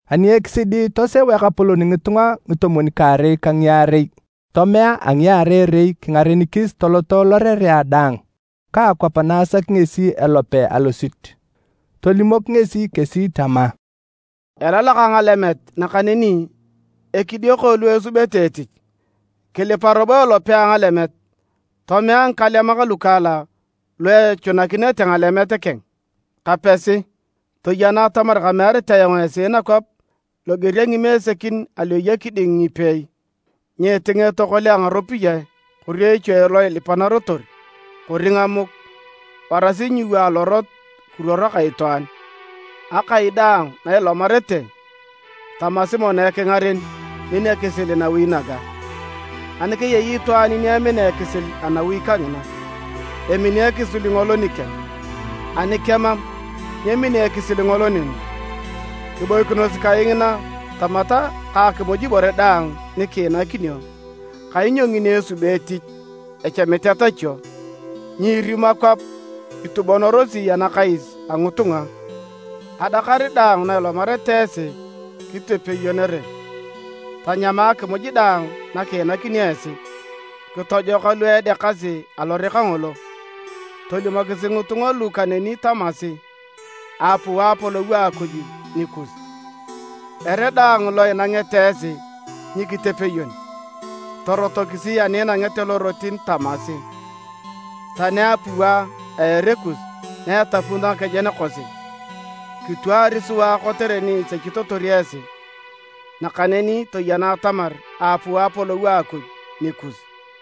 Ani ekisidi toseu Ekapolon ngitunga ngitomwon-kaarei ka ngiarei tomea a ngiarei-rei kingarenikis toloto lorerea daang ka akwap na asaki ngesi elope alosit. Tolimok ngesi kesi tama, “Elalak ngalemet nakaneni ekidioko lu esubete etich. Kilipa robo elope a ngalemet tomea ngikalemak lukaalak lu echunakinete ngalemet keng. Kapesi! Toyena atamar kamearit ayong esi nakwap loger a ngimesekin alu eya kiding ngipeei. Nyiitinga etokole a ngaropiyae, kori echue lo ilipanarotor, kori ngamuk, warasi nyiiwa alorot kiruoro ka itwaan. Akai daang na ilomarete, tamasi mono ekingaren, ‘Min ekisil nawi naga.’ Ani keyei itwaan ni emina ekisil anawi kangina, emini ekisil ngolo nikeng, ani kemam, nyemini ekisil ngolo neni. Kiboikinos kai ngina tamata ka akimuj ibore daang nikiinakinio, kainyo ngini esubi etich, echamit etachio. Nyiirimo akwap itubonorosi anakais a ngitunga. Adakar daang na ilomarete esi kitepeyonere, tanyama akimuj daang na kiinakinio esi. Kitojoka lu edeakasi alore kangolo, tolimokisi ngitunga lu kaneni tamasi, ‘Aapuu Apolou a Akuj nikus.’ Ere daang lo inangete esi nyikitepeyon, torotokisi ani inangete lorotin tamasi, ‘Tani apua a ere kus na etapunito ngakejen kosi, kitwaari sua kotere ni isechitotor esi. Nakaneni toyena atamar aapuu Apolou a Akuj nikus!’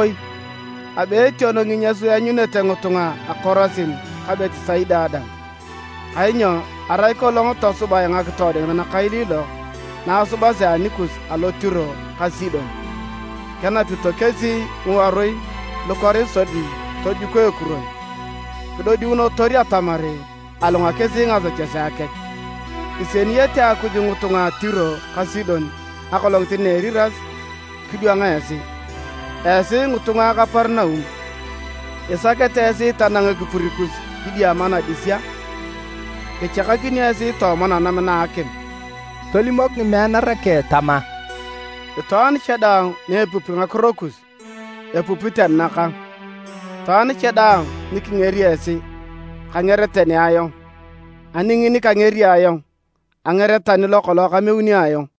“Oitiakoi! Abe etioko nginyas lu eanyunete ngitunga a Korasin ka Betisaida dang! Kainyo arai kolong tosubae ngakitoodikinet nakailiilok na asubasi anikus alo Tiro ka Sidon, kenapito kesi ngiworui lukoris sodi tojuko ekuron kidodiunotor atamar alunga kesi ngasechesea kech! Isieniyete Akuj ngitunga a Tiro ka Sidon Akolongit na Eriras kidwang esi. Esi ngitunga a Kaperinaum! Isakete esi tanang ekipur kus kidiama nadis a? Kichakakinio esi tooma nanam na a akim!” Tolimok ngimeanara keng tama, “Itwaan cha daang ni epupi ngakiro kus, epupi tani nakang, itwaan cha daang ni kingeri esi, kanger tani ayong, ani ngini kangeri ayong, anger tani lokolong kameuni ayong.”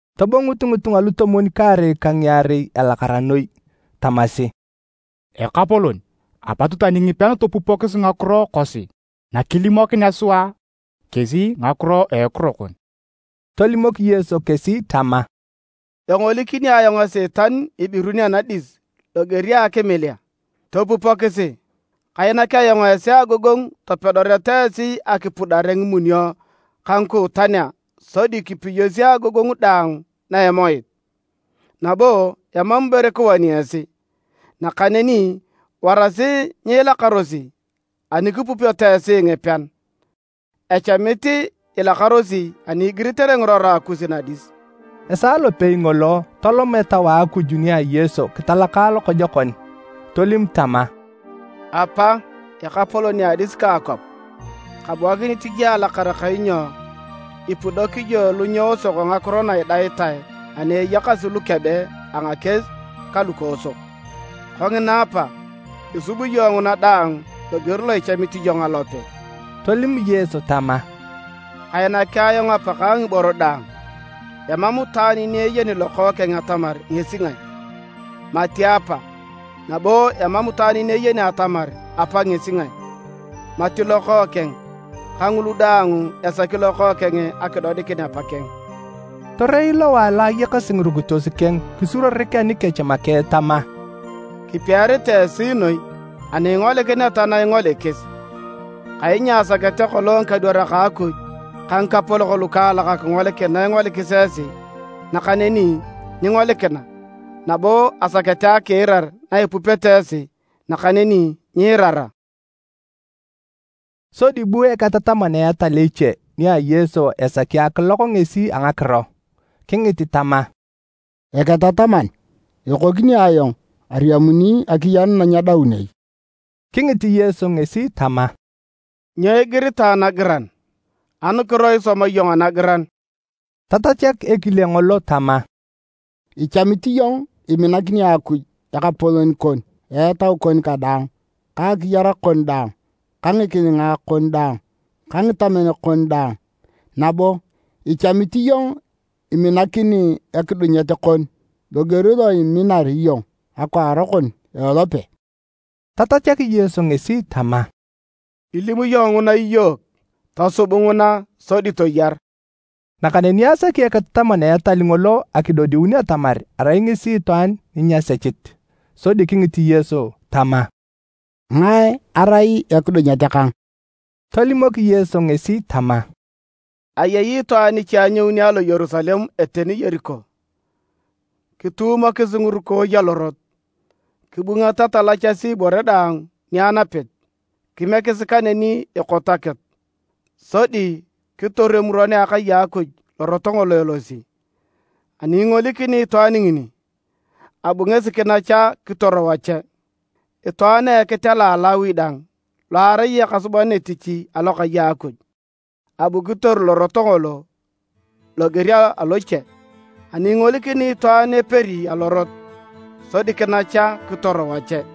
Tobongut ngitunga lutomwon-kaarei ka ngiarei elakara noi. Tamasi, “Ekapolon, apot tani ngipean topupokis ngakiro kosi nakilimokinea sua kesi ngakiro a ekiro kon!” Tolimok Yesu kesi tama, “Engolikini ayong Esiitan ibirun anadis loger a akimilea. Topupokisi! Kainak ayong esi agogongu topedoreta esi akipudare ngimunio ka ngikuutanea sodi kipiyosi agogongu daang na a Emoit, nabo emam ibore kiwani esi. Nakaneni warasi nyiilakarosi ani kipupeto esi ngipean, echamit ilakarosi ani igiritere ngirora kus nadis.” Esaa lopei ngolo tolom Etau a Akuj nia Yesu kitalaka lokojokon, tolim tama, “Apa, Ekapolon a adis ka kwap! Kabuakinit iyong alakara kainyo ipudok iyong lu nyeosok ngakiro na idaitae ani eyakasi lukebe a ngakies ka lukoosok. Kongina Apa, isub iyong nguna daang loger lo ichamit iyong alope.” Tolim Yesu tama, “Kainaki ayong Apakang ngiboro daang: emam itwaan ni eyeni Lokookeng atamar ngesi ngae, mati Apa, nabo emam itwaan ni eyeni atamar Apa ngesi ngae, mati Lokookeng ka ngulu daang esaki Lokookeng akidodikin Apa keng.” Torei lowae lo ayakasi ngirukitos keng kisuruorik anikech make tama, “Kipiaritae esi noi ani ingolikineta na ingolikis! Kainyo asakete kolong ngikadwarak a Akuj ka ngikapolok lukaalak akingolikin na ingolikis esi, nakaneni nyingolikina, nabo asakete akiirar na ipupete esi, nakaneni nyiirara.” Sodi bu eketataman a etal eche nia Yesu esaki akilok ngesi a ngakiro. Kingit tama, “Eketataman, ekokini ayong ariamuni akiyar na nyedaun ai?” Kingit Yesu ngesi tama, “Nyo igiritae nagiran? Anukiro isoma iyong anagiran?” Tatachak ekile ngolo tama, “Echamit iyong iminakini Akuj Ekapolon kon a etau kon kadaang, ka akiyar kon daang, ka ngikilinga kon daang ta ngitamen kon daang, ‘Nabo echamit iyong iminakini ekidunyet kon loger lo iminar iyong akwaan kon a ilope.’” Tatachak Yesu ngesi tama, “Ilim iyong nguna iyook, tosub nguna sodi toyar.” Nakaneni asaki eketataman a etal ngolo akidodiun atamar arai ngesi itwaan ni nyasechit, sodi kingit Yesu tama, “Ngae erai ekidunyet kang?” Tolimok Yesu ngesi tama, “Ayei itwaan iche anyouni alo Yerusalem eteni Yeriko, kituumokis ngirukooi alorot, kibungata talachasi ibore daang ni anapit. Kimiekis kaneni ekot akitu. Sodi kitoru emuron a akai a Akuj lorot ngolo elosi, ani ingolikini itwaan ngini, abu ngesi kinacha kitor wache. Itwaan a ekitela a Lawi dang lo arai ekasuban etich Alokai a Akuj, abu kitoru lorot ngolo loger a loche, ani ingolikini itwaan eperi alorot, sodi kinacha kitor wache.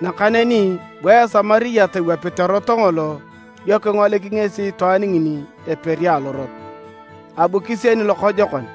Nakaneni bu Esamariat iwapit erot ngolo dio kingolik ngesi itwaan ngini eperi alorot, abu kisieni lokojokon.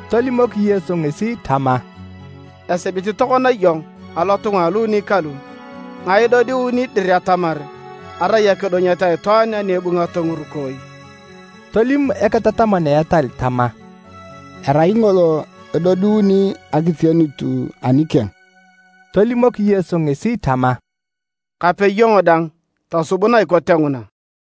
Tolimok Yesu ngesi tama, “Esibit tokona iyong alotunga aluuni kalu, ngae edodiuni dir atamar arai ekidunyet a itwaan ani ebungato ngirukooi?” Tolim eketataman a etal tama, “Erai ngolo edodiuni akisienut anikeng.” Tolimok Yesu ngesi tama, “Kape iyong dang tosub na ikote nguna.”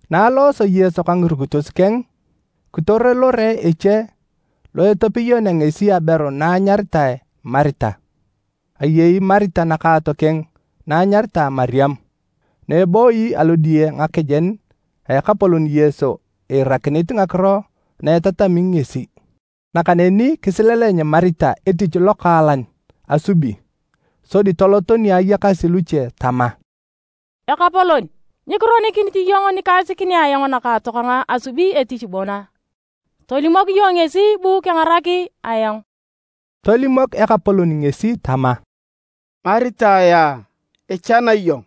Na alooso Yesu ka ngirukitos keng, kitoro lore eche lo etepeyonea ngesi aberu na anyaritae Marita. Ayei Marita nakaatokeng na anyaritae Mariam na ebooyi alodiye ngakejen a Ekapolon Yesi iirakinit ngakiro na etatami ngesi. Nakaneni kisileleny Marita etich lokaalan asubi, sodi tolot ni ayakasi luche tama, “Ekapolon, nyikironikinit iyong nikaisikinea ayong nakaatokang asubi etich bon a? Tolimok iyong ngesi bu kengarak ayong!” Tolimok Ekapolon ngesi tama, “Marita yaa! Ichana iyong,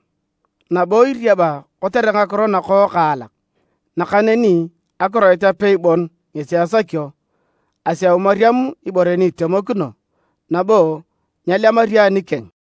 nabo iriaba kotere ngakiro nakokaalak, nakaneni akiroit apei bon ngesi esakio. Aseu Mariam ibore ni itemokino, nabo nyelemario anikeng.”